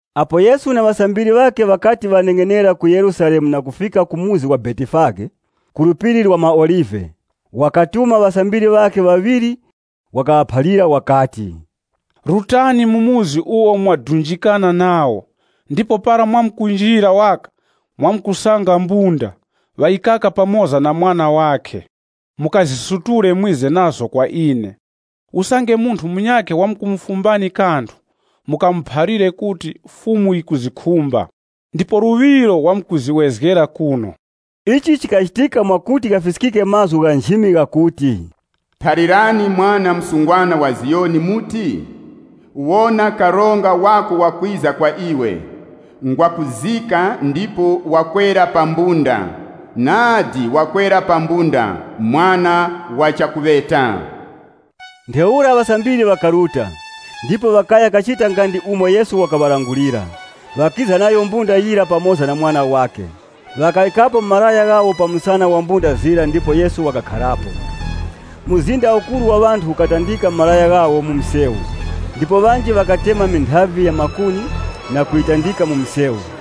Apo Yesu na ŵasambiri ŵakhe ŵakati ŵaneng'enera ku Yerusalemu na kufika pa muzi wa Betifage, ku Phiri la maOlive, wakatuma ŵasambiri ŵakhe ŵaŵiri. Wakaŵaphalira wakati, “Rutani mu chikaya icho mwadunjikana nacho ndipo para mwakunjira waka mwamkusanga mbunda, ŵayikaka pamoza na mwana wakhe. Mukazisutule mwize nazo kwa ine. Usange munthu munyakhe wamkumufumbani kanthu, mukamuphalire kuti, ‘Fumu yikuzikhumba,’ ndipo luŵiro wamkuziwezgera kuno.” Ichi chikachitika mwakuti ghafiskike mazgu gha nchimi ghakuti, “Phalirani ŵanthu ŵa mu Ziyoni kuti, ‘Wonani, karonga winu wakwiza kwa imwe. Ngwakuzika ndipo wakwera pa mbunda, inya wakwera pa kamwana ka mbunda!’” Ntheura ŵasambiri ŵakaruta, ndipo ŵakaya kachita nga ndi umo Yesu wakaŵalangulira. Ŵakiza nayo mbunda yira pamoza na mwana wakhe, ŵakaŵikapo malaya ghawo pa msana wa mbunda zira ndipo Yesu wakakharapo. Mzinda ukuru wa ŵanthu ukatandika malaya ghawo mu msewu, ndipo ŵanji ŵakatema minthavi ya makuni na kuyitandika mu msewu.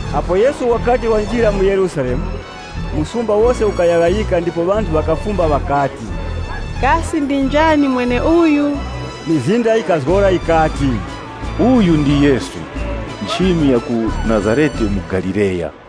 Apo Yesu wakati wanjira mu Yerusalemu, msumba wose ukayaghayika ndipo ŵanthu ŵakafumba ŵakati, “Kasi ndi njani mweneuyu?” Mizinda yikazgora yikati, “Uyu ndi Yesu nchimi ya ku Nazarete mu Galileya.”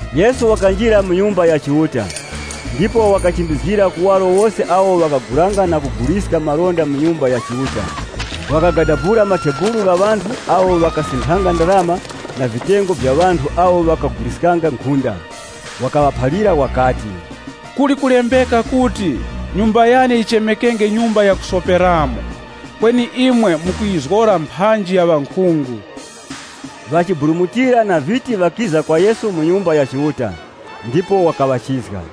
Yesu wakanjira mu Nyumba ya Chiuta ndipo wakachimbizgira kuwaro wose awo ŵakagulanga na kuguliska malonda mu Nyumba ya Chiuta. Wakagadabula matebulu gha ŵanthu awo ŵakasinthanga ndarama na vitengo vya ŵanthu awo ŵakaguliskanga nkhunda. Wakaŵaphalira wakati, “Kuli kulembeka kuti, ‘Nyumba yane yichemekenge nyumba yakusoperamo.’ Kweni imwe mukuyizgora mphanji ya ŵankhungu.” Ŵachiburumutira na viti ŵakiza kwa Yesu mu Nyumba ya Chiuta, ndipo wakaŵachizga.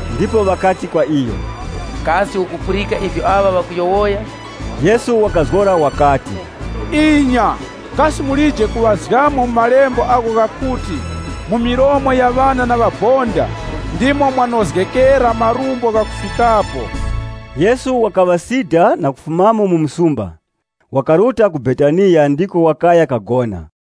Ndipo ŵakati kwa iyo, “Kasi ukupulika ivyo aŵa ŵakuyowoya?” Yesu wakazgora wakati, “Inya, kasi mulije kuŵazgamo mu malembo agho ghakuti, ‘Mu milomo ya ŵana na ŵabonda ndimo mwanozgera marumbo ghakufikapo.’” (LXX) Yesu wakaŵasida na kufumamo mu msumba, wakaruta ku Betaniya ndiko wakaya kagona.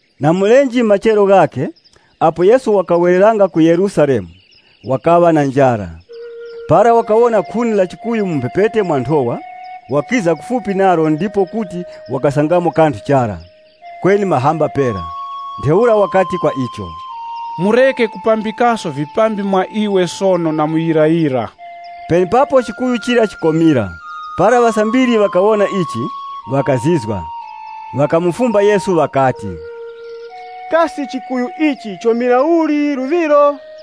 Na mulenje machero ghakhe, apo Yesu wakawereranga ku msumba wa Yerusalemu, wakaŵa na njara. Para wakawona khuni la chikuyu mu mphepete mwa nthowa, wakiza kufupi nalo ndipo kuti wakasangamo kanthu chara, kweni mahamba pera. Ntheura wakati kwa icho, “Mureke kupambikaso vipambi mwa iwe sono na muyirayira!” Penepapo chikuyu chira chikomira. Para ŵasambiri ŵakawona ichi, ŵakazizwa. Ŵakamufumba Yesu ŵakati, “Kasi chikuyu ichi chomira uli luŵiro?”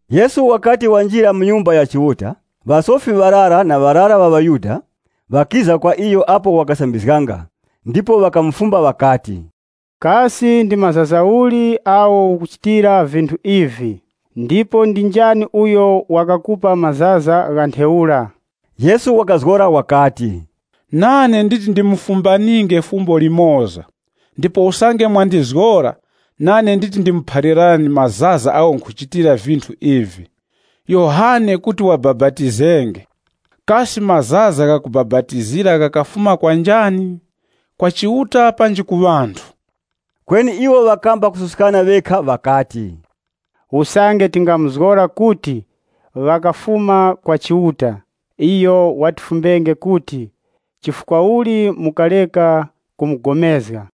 Yesu wakati wanjira mu Nyumba ya Chiuta, ŵasofi ŵarara na ŵarara ŵa ŵaYuda ŵakiza kwa iyo apo wakasambizganga ndipo ŵakamufumba ŵakati, “Kasi ndi mazaza uli agho ukuchitira vinthu ivi? Ndipo ndi njani uyo wakakupa mazaza gha ntheura?” Yesu wakazgora wakati, “Nane nditi ndimufumbaninge fumbo limoza, ndipo usange mwandizgora, nane nditi ndimuphalirani mazaza agho nkhuchitira vinthu ivi. Yohane kuti wabapatizenge, kasi mazaza ghakubapatizira ghakafuma kwa njani? Kwa Chiuta panji ku ŵanthu?” Kweni iwo ŵakamba kususkana ŵekha ŵakati, “Usange tingamuzgora kuti, ‘Ghakafuma kuchanya,’ iyo watifumbenge kuti, ‘Chifukwa uli mukareka kupulikana?’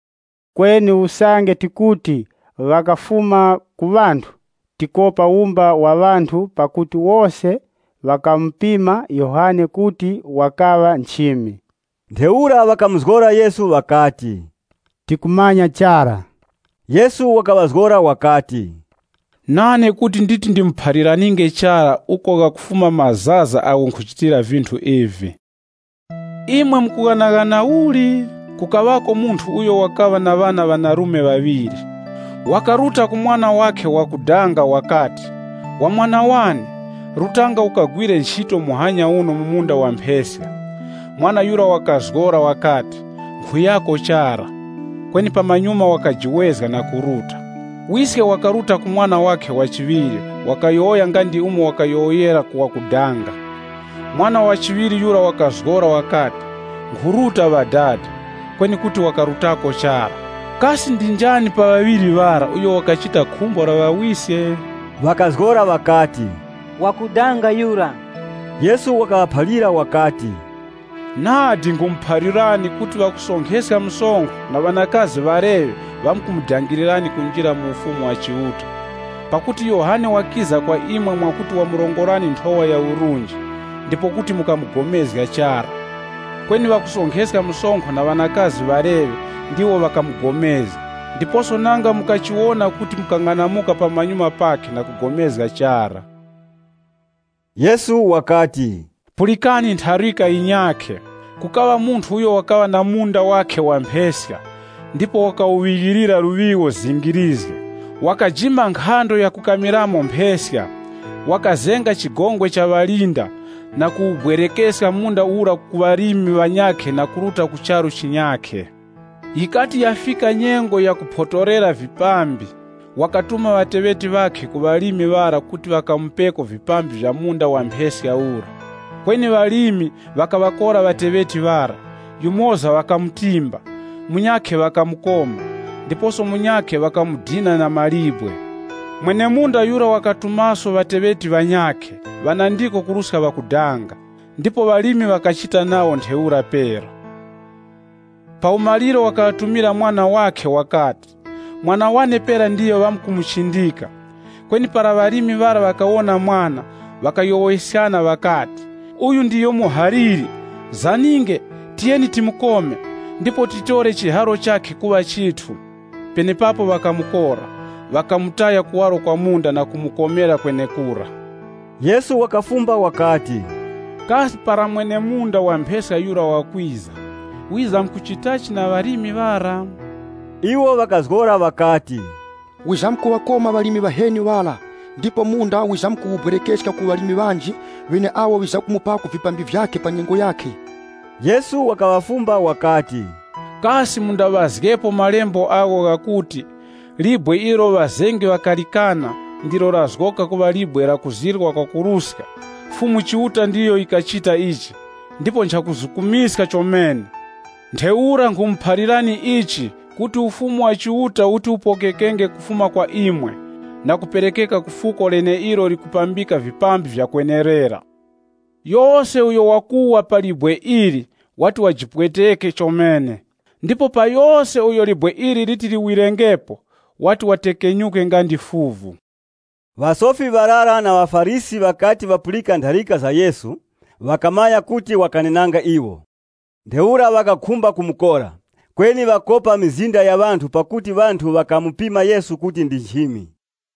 Kweni usange tikuti, ‘Ghakafuma ku ŵanthu,’ tikopa wumba wa ŵanthu, pakuti wose ŵakamupima Yohane kuti wakaŵa nchimi.” Ntheura ŵakamuzgora Yesu ŵakati, “Tikumanya chara.” Yesu wakaŵazgora wakati, “Nane kuti nditi ndimuphaliraninge chara uko ghakafuma mazaza agho nkhuchitira vinthu ivi.” “Imwe mukughanaghana uli? Kukaŵako munthu uyo wakaŵa na ŵana ŵanarume ŵaŵiri. Wakaruta ku mwana wakhe wakudanga wakati, ‘Wa mwana wane, rutanga ukagwire nchito muhanya uno mu munda wa mpheska.’ Mwana yura wakazgora wakati, ‘Nkhuyako chara.’ Kweni pamanyuma wakajiwezga na kuruta. Wiske wakaruta ku mwana wakhe wa chiŵiri wakayowoya nga ndi umo wakayowoyera ku wakudanga. Mwana wa chiŵiri yura wakazgora wakati, ‘Nkhuruta, ŵadada.’ Kweni kuti wakarutako chara. Kasi ndi njani pa ŵaŵiri ŵara uyo wakachita khumbo la ŵawiske?” Ŵakazgora ŵakati, “Wakudanga yura.” Yesu wakaŵaphalira wakati, “Nadi nkhumuphalirani kuti ŵakusonkheska msonkho na ŵanakazi ŵaleŵe wakumudangirirani kunjira mu Ufumu wa Chiuta Pakuti Yohane wakiza kwa imwe mwakuti wamurongorani nthowa ya urunji, ndipo kuti mukapulikana chara. Kweni ŵakusonkheska msonkho na ŵanakazi ŵaleŵe ndiwo ŵakapulikana nayo. Ndiposo nanga mukachiwona kuti mukang'anamuka pamanyuma pakhe na kugomezga chara.” Yesu wakati, “Pulikani ntharika yinyakhe. Kukaŵa munthu uyo wakaŵa na munda wakhe wa mpheska, ndipo wakawuŵighilira luŵigho zingirizge. Wakajima nkhando yakukamiramo mpheska, wakazenga chigongwe cha ŵalinda na kuwubwerekeska munda ura ku ŵalimi ŵanyakhe na kuruta ku charu chinyakhe. Yikati yafika nyengo ya kuponthorera vipambi, wakatuma ŵateŵeti ŵakhe ku ŵalimi ŵara kuti ŵakamupeko vipambi vya mu munda wa mpheska ura. Kweni ŵalimi, ŵakaŵakora ŵateŵeti ŵara, yumoza ŵakamutimba, munyakhe ŵakamukoma, ndiposo munyakhe ŵakamudina na mawe. Mwene-munda yura wakatumaso ŵateŵeti ŵanyakhe, ŵanandiko kuruska ŵakudanga, ndipo ŵalimi ŵakachita nawo ntheura pera. Pa umaliro wakaŵatumira mwana wakhe wakati, ‘Mwana wane pera ndiyo ŵamkumuchindika.’ Kweni para ŵalimi ŵara ŵakawona mwana, ŵakayowoyeskana ŵakati, ‘Uyu ndiyo muhaliri, zaninge, tiyeni timukome, ndipo titore chiharo chakhe kuŵa chithu.’ Penepapo ŵakamukora, ŵakamutaya kuwaro kwa munda na kumukomera kwenekura.” Yesu wakafumba wakati, “Kasi para mwene-munda wa mpheska yura wakwiza, wizamkuchitachi na ŵalimi ŵara?” Iwo ŵakazgora ŵakati, “Wizamkuŵakoma ŵalimi ŵaheni ŵara, ndipo munda wizamkuwubwerekeska ku ŵalimi ŵanji, ŵeneawo ŵiza kumupako vipambi vyakhe pa nyengo yakhe.” Yesu wakaŵafumba wakati, “Kasi mundaŵazgepo malembo agho ghakuti, ‘Libwe ilo ŵazengi ŵakalikana, ndilo lazgoka nkhorezgero ya chingodya. Fumu Chiuta ndiyo yikachita ichi, ndipo nchakutizukumiska chomene!’ “Ntheura ichi nkhumuphalirani kuti Ufumu wa Chiuta uti upokekenge kufuma kwa imwe na kuperekeka ku fuko leneilo likupambika vipambi vyakwenerera.” [ Yose uyo wakuwa pa libwe ili wati wajipweteke chomene, ndipo pa yose uyo libwe ili liti liwirengepo, wati watekenyuke nga ndi fuvu.] Ŵasofi ŵarara na ŵaFarisi ŵakati ŵapulika ntharika za Yesu, ŵakamanya kuti wakanenanga iwo. Ntheura ŵakakhumba kumukora, kweni ŵakopa mizinda ya ŵanthu pakuti ŵanthu ŵakamupima Yesu kuti ndi nchimi.